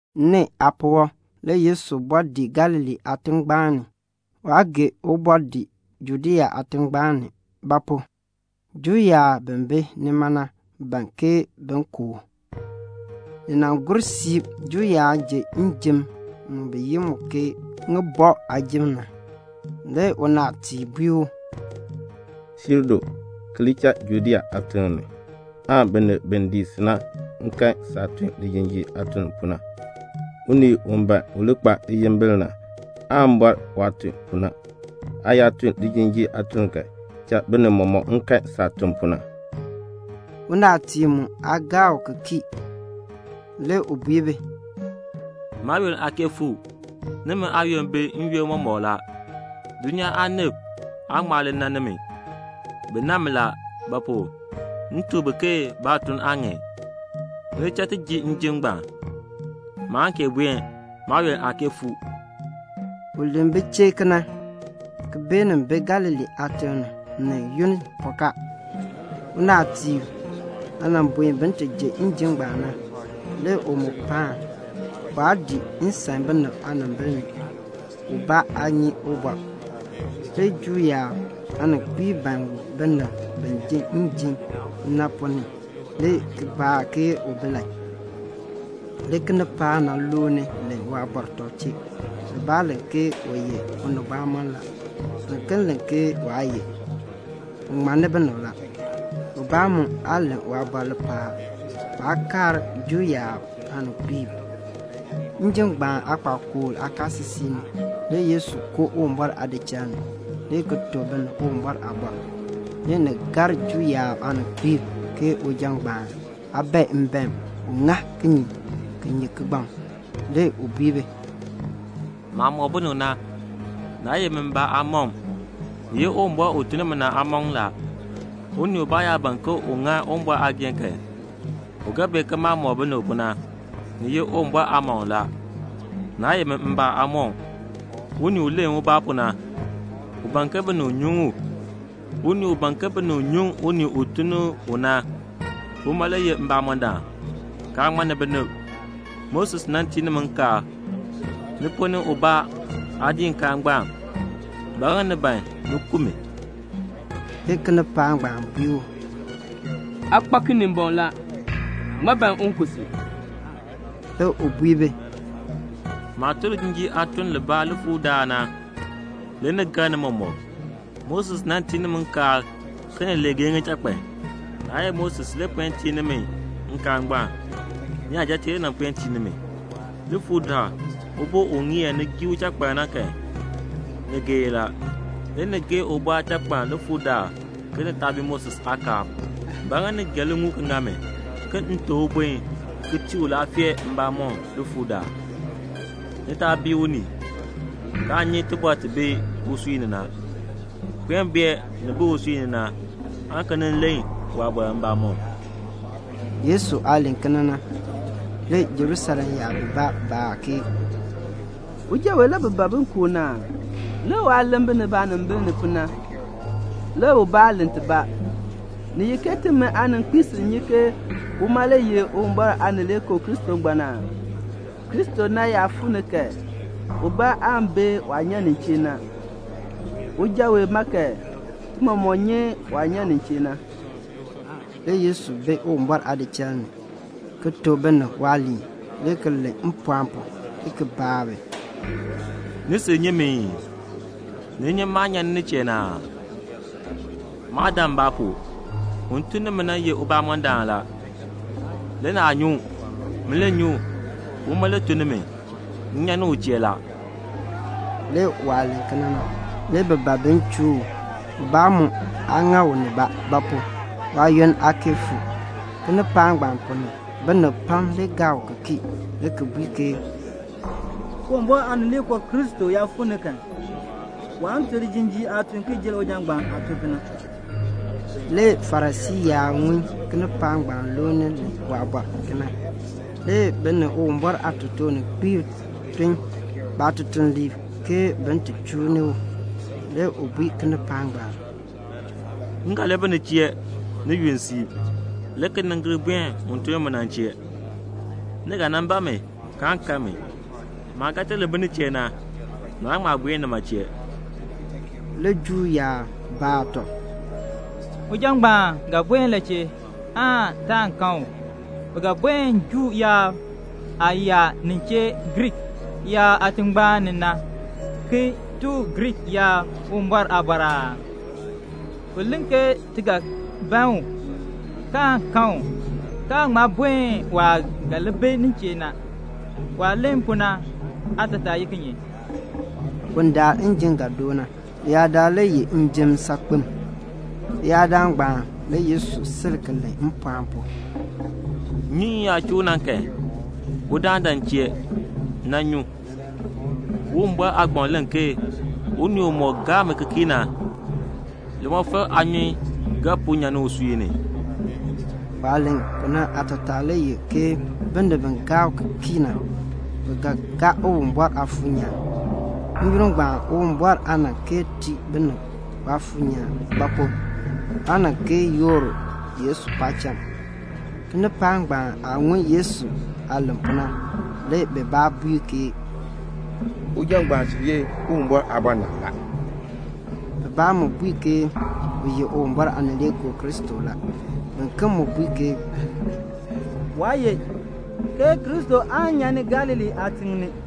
Nee aapuwɔb le Yesu bɔɔ dii Galilee aatingbaan ni. Waa gee u bɔɔ dii Judea aatingbaan ni; ba pu? Juu yaab bi bi nima na ban ke bin ku u. Ni nan gur siib, Juu yaab ji njim mu bi yi mu ke ŋibɔk aajim na. Le unaatiib bui u, "Siir du, ki li cha Judea aatiŋ ni, aan binib bi dii si na mu kan saah tun lijinjiir aatun pu na. Unii u ban u li kpa liyimbil na, waan bɔr waah tun pu na. Aa yaa tun lijinjiir aatun kan, cha binib mɔmɔk kan saah tun pu na." (Unaatiib mu aa gaa u ki kii.) Le u bui bi, "Maayoonn aa kee fuu. Nimi aayoonn bi n-yoonn mɔmɔk la. Dulnyaa aanib aa ŋma li nan nimi. Bi nan mi la; ba pu? m tuk bi ke baatuln aa ŋan. Ni li cha ti ji njim ngbaan. Maan kee buen; maayoonn aa kee fuu." U len bi chee kena, ki beenin bi Galilee aatiŋ ni, ni yunn pɔkaa. Unaatiib aah buen bin ti ji njim ngbaan na, le u mu paan. Waa dii nsan binib aanimbil ni, ubaa aa nyi ubɔr. Le Juu yaab aaninkpiib ban u binib bi ji njim na ponn ni, le ki baa ke u bi la. Le kinipaak na looni len waabɔr tɔb chee. Bibaa len ke u ye unibamɔnn la. Biken len ke waa ye, u ŋmanni binib la. Ubaa mu aa len waabɔr lipaal; baa kaar Juu yaab aaninkpiib. Njim ngbaan aakpakool aakaasisik ni le Yesu koo Uwumbɔr aadichal ni, le ki tuk binib Uwumbɔr aaliin. Le ni gar Juu yaab aaninkpiib, ke uja ngbaan aa bae mbaen; u ŋa kinye ki nyi kigbaŋ? Le u bui bi, "Maah mɔk binib na, naa ye min mbaa aamɔkm, ni ye Uwumbɔr u tun ni mi na aamɔkm la. Unii ubaa yaa ban ke un ŋa Uwumbɔr aageehn kan, u ga bee ke maah mɔk binib pu na, ni ye Uwumbɔr aamɔkm la, naa ye min mbaa aamɔkm. Unii u len ubaa pu na, u ban ke binib nyuŋ u. Unii u ban ke binib nyuŋ unii u tun ni u na, uma le ye mbamɔndaan, kaa ŋmanni binib. Moses nan tii nimi nkaal. Ni ponn ni ubaa aa dii nkaal ngbaan. Ba ŋa ni ban ni ku mi?" Le kinipaak ngbaan bui u, "Aa kpa Kinimbɔŋ la. Ŋmaa ban un ku si?" Le u bui bi, "Maah tun lijinjiir aatuln libaa likpakool daal na, le ni gar ni mɔmɔk. Moses nan tii nimi nkaal ke ni li geei ŋichakpan. (Naa ye Moses le puen tii nimi nkaal ngbaan. Niyajatiib le puen tii nimi.) Likpakool daal ubo u ŋeer ni gii uchakpaln na kan, ni geei la. Le ni geei ubo aachakpaln likpakool daal ke ni taa bii Moses aakaal. Ba ŋa ni gee liŋuul ki ŋa mi, ke m teb ubun ki tii u laafee mbamɔm likpakool daal? Ni taa bii unii, kaa nyi tibɔr ti bi usui ni na. Puen bee nin bi usui ni na, aan ki nin len waabɔr mbamɔm." Yesu aah len kena na, le Jerusalem yaab bibaa baa ke, "Uja wee le bi ban bin ku u na aa? Lik waah len binib aanimbil ni pu na, le ubaa aa len tibaa. Ni ye ke timi aaninkpiib sil nyi ke uma le ye Uwumbɔr Aanileekoo Kristo ngbaan aa? Kristo na yaa fuu ni kan, ubaa aan bee waah nyan nin chee na. Uja wee ma kan, ti mɔmɔk nyi waah nyan nin chee na." Le Yesu bi Uwumbɔr aadichal ni, ki tuk binib waaliin, le ki len mpɔɔn pu, le ki baa bi, "Ni sil nyi mi ii? ni nyi maah nyan nin chee na aa? Maa dan mbaa pu. Un tun ni mi na ye mbamɔndaan la. Le naa nyi u. Min le nyi u; uma le tun ni mi. M nyan ni u chee la." Le waah len kena na, le bi ban bin chuu u. Ubaa mu aa ŋa u nibaa; ba pu? waayoonn aa kee fuu. Kinipaak ngbaan ponn ni binib pam le gaa u ki kii, le ki bui ke, "Uwumbɔr Aanileekoo Kristo yaa fuu ni kan, waan tun lijinjiir aatun ki jer uja ngbaan aah tun pu na." Le Farisii yaab ŋun kinipaak ngbaan looni len waabɔr kena. Le bi ni Uwumbɔr aatotoorninkpiib tun baatutuliib ke bin ti chuu ni u. Le u bui kinipaak ngbaan, "M ga li bi ni chee ni yunn siib, le ki nin gir buen un tun ni mi na chee. Ni ga nan ban mi, kaan kan mi. Maah ga ti li bi nin chee na, naan ŋma buen nima chee." Le Juu yaab baa tɔb, "Uja ngbaan ga buen la chee, aan taan kan u? U ga buen Juu yaab aah yaa nin chee Griik yaab aatingbaan ni na, ki tuk Griik yaab Uwumbɔr aaliin aa? U len ke ti ga ban u, kaan kan u, kaan ŋma buen waah ga li bi nin chee na. Waah len pu na aatataa ye kinye?" Bundaln njim ga doo na, leyaadaal le ye njim saakpem. Leyaadaal ngbaan le Yesu sil ki len mpɔɔn pu, "Nnyunyun yaa chuu u na kan, udaan dan m chee ki nan nyu. Uwumbɔr aagbaŋ len ke 'Unii umɔk gaa mi ki kii na, limɔfal aanyun ga puu nyan ni usui ni."' Waah len pu na aatataa le ye ke binib bi gaa u ki kii na, bi ga gaa Uwumbɔr Aafuur nyaan. N-yoonn ngbaan Uwumbɔr aa nan kee tii binib Waafuur nyaan; ba pu? waa nan kee yoor Yesu paacham. Kinipaak ngbaan aah ŋun Yesu aah len pu na, le bibaa bui ke "Uja ngbaan sil ye Uwumbɔr Aabɔnabr na la." Bibaa mu bui ke u ye Uwumbɔr Aanileekoo Kristo la. Biken mu bui ke, "Waa ye, ke Kristo aan nyan ni Galilee aatiŋ ni.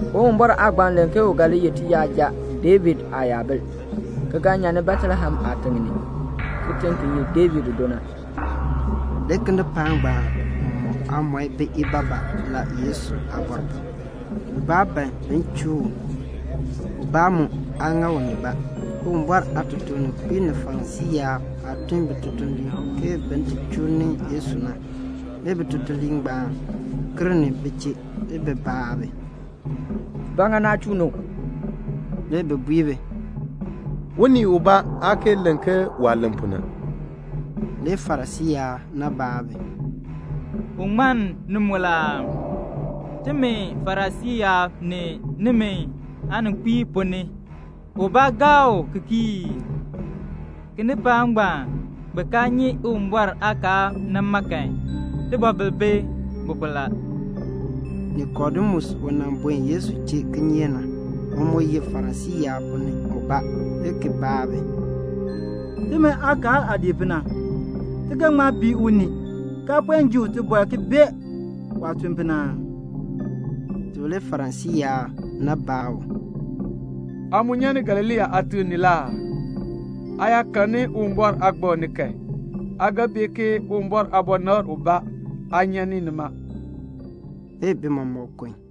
Uwumbɔr aagbaŋ len ke u ga li ye tiyaja David aayabil, ki ga nyan ni Betlehem aatiŋ ni, kitiŋ ki ye David do na." Le kinipaak ngbaan mɔk aamɔi bi ibaabaa la le Yesu aabɔr ni. Bibaa ban bin chuu u. Ubaa mu aa ŋa u nibaa. Uwumbɔr aatotoorninkpiib ni Farisii yaab aah tun bitutuliib ke bin ti chuu ni Yesu na, le bitutuliib ngbaan gir ni bi chee. Le bi baa bi, "Ba ŋa naa chuu ni u?" Le bi bui bi, "Unii ubaa aa kee len ke waah len pu na." Le Farisii yaab na baa bi, "U ŋmann ni mu la aa? Timi Farisii yaab ni nimi aaninkpiib ponn ni ubaa gaa u ki kii ii? Kinipaak ngbaan bi kaa nyi Uwumbɔr aakaal na ma kan, tibɔbil bi bi pu la." Nikodemus u nan buen Yesu chee kinyeek na, u mu ye Farisii yaab ponn ni ubaa, le ki baa bi, "Timi aakaal aah dii pu na, ti ga ŋma bii unii see ti puen ji u tibɔr ki bee waah tun pu na aa?" Le Farisii yaab na baa u, "Aa mu nyan ni Galilee aatiŋ ni la aa? Aa yaa karn Uwumbɔr aagbaŋ ni kan, aa ga bee ke Uwumbɔr aabɔnabr ubaa aa nyan ni nima." [Le bi mɔmɔk kun.